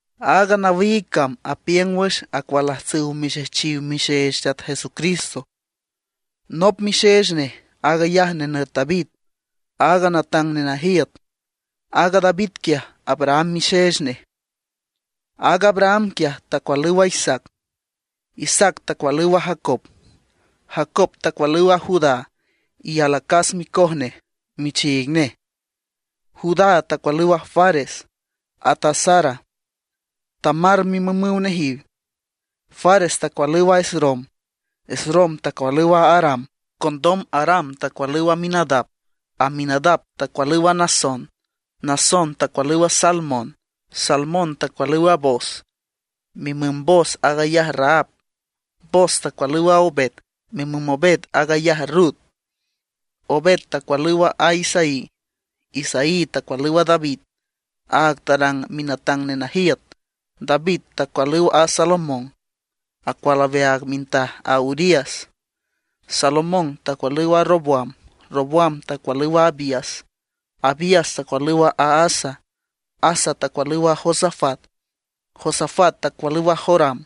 Aaga nawiig cam apiüng wüx acualajtsüw mixejchiw mixeech Teat Jesucristo. Nop mixeech nej aag ayaj nenüt David aaga natang nenajiüt; aaga David quiaj Abraham mixeech nej. Aaga Abraham quiaj tacualüw a Isaac, Isaac tacualüw a Jacob, Jacob tacualüw a Judá, y alacas micoj nej michiig nej. Judá tacualüw a Fares, at a Zara, Tamar mimümüw nejiw. Fares tacualüw a Esrom, Esrom tacualüw a Aram. Condom Aram tacualüw a Aminadab, Aminadab tacualüw a Naasón, Naasón tacualüw a Salmón. Salmón tacualüw a Booz, mimüm Booz aag ayaj Rahab. Booz tacualüw a Obed, mimüm Obed aag ayaj Rut. Obed tacualüw a Isaí. Isaí tacualüw a David, áag tarang minatang nenajiüt. David tacualüw a Salomón, acual aweaag mintaj a Urías. Salomón tacualüw a Roboam, Roboam tacualüw a Abías, Abías tacualüw a Asa. Asa tacualüw a Josafat, Josafat tacualüw a Joram,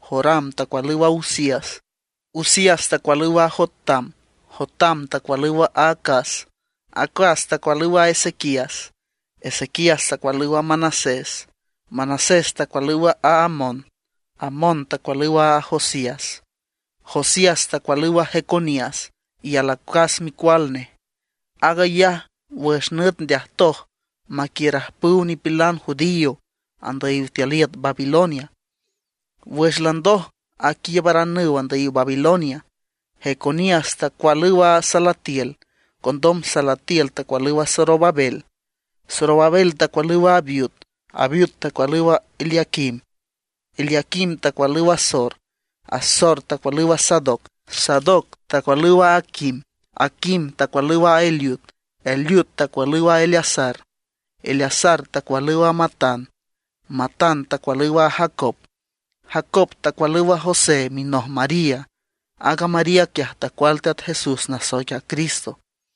Joram tacualüw a Uzías. Uzías tacualüw a Jotam, Jotam tacualüw a Acaz, Acaz tacualüw a Ezequías. Ezequías tacualüw a Manasés, Manasés tacualüw a Amón, Amón tacualüw a Josías. Josías tacualüw a Jeconías y alacas micual nej. Aag ayaj wüx nüt ndeajtoj maquiiürajpüw nipilan judío andüyiw tiül iüt Babilonia. Wüx landoj aquiiübaranüw andüyiw Babilonia, Jeconías tacualüw a Salatiel, condom Salatiel tacualüw a Zorobabel. Zorobabel tacualüw a Abiud, Abiud tacualüw a Eliaquim, Eliaquim tacualüw a Azor. Azor tacualüw a Sadoc, Sadoc tacualüw a Aquim, Aquim tacualüw a Eliud. Eliud tacualüw a Eleazar, Eleazar tacualüw a Matán, Matán tacualüw a Jacob. Jacob tacualüw a José minoj María. Aaga María quiaj tacual Teat Jesús nasoic a Cristo.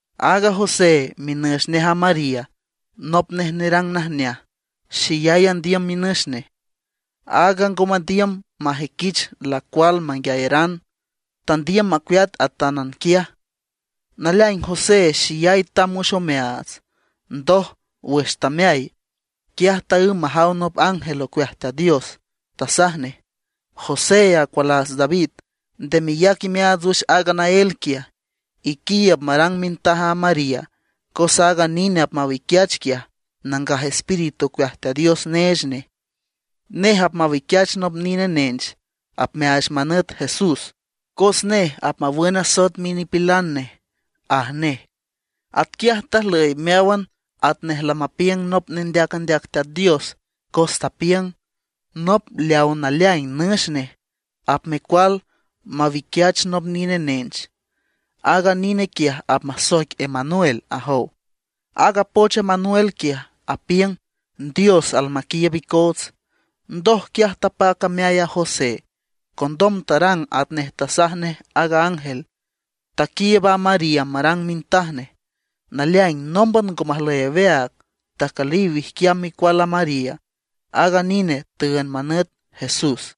Aaga José minench nej a María nop nej nerang najneaj. Xeyay andiüm minüx nej, áag ngo mandiüm majüiquich lacual manguiayeran; tandiüm macueat atánan quiaj. Naleaing José xeyay tamb wüx omeaats. Ndoj, wüx tameay, quiaj taǘm majaw nop ángel ocueaj Teat Dios. Tasaj nej: ―José acualaats David, nde meyac imeaats wüx aaga naél quiaj, iquiiüb marang mintaj a María, cos aaga nine apmawiquiach quiaj Nangaj Espíritu ocueaj Teat Dios neech nej. Nej apmawiquiach nop nine nench apmeaach manüt Jesús, cos nej apmawün asoet minipilan nej ―aj nej. Atquiaj tajlüy meáwan atnej lamapiüng nop nendeac andeac Teat Dios, cos tapiüng: Nop leawa naleaing nüx nej apmecual mawiquiach nop nine nench. Aaga nine quiaj apmasoic Emanuel, ajow. Aaga poch Emanuel quiaj, apiüng: Dios almaquiiüb icoots. Ndoj quiaj tapac ameay a José. Condom tarang atnej tasaj nej aaga ángel; taquiiüb a María marang mintaj nej. Naleaing nómban ngo majlüy aweaag, tacüliw wijquiam micual a María. Aaga nine tüünd manüt JESS.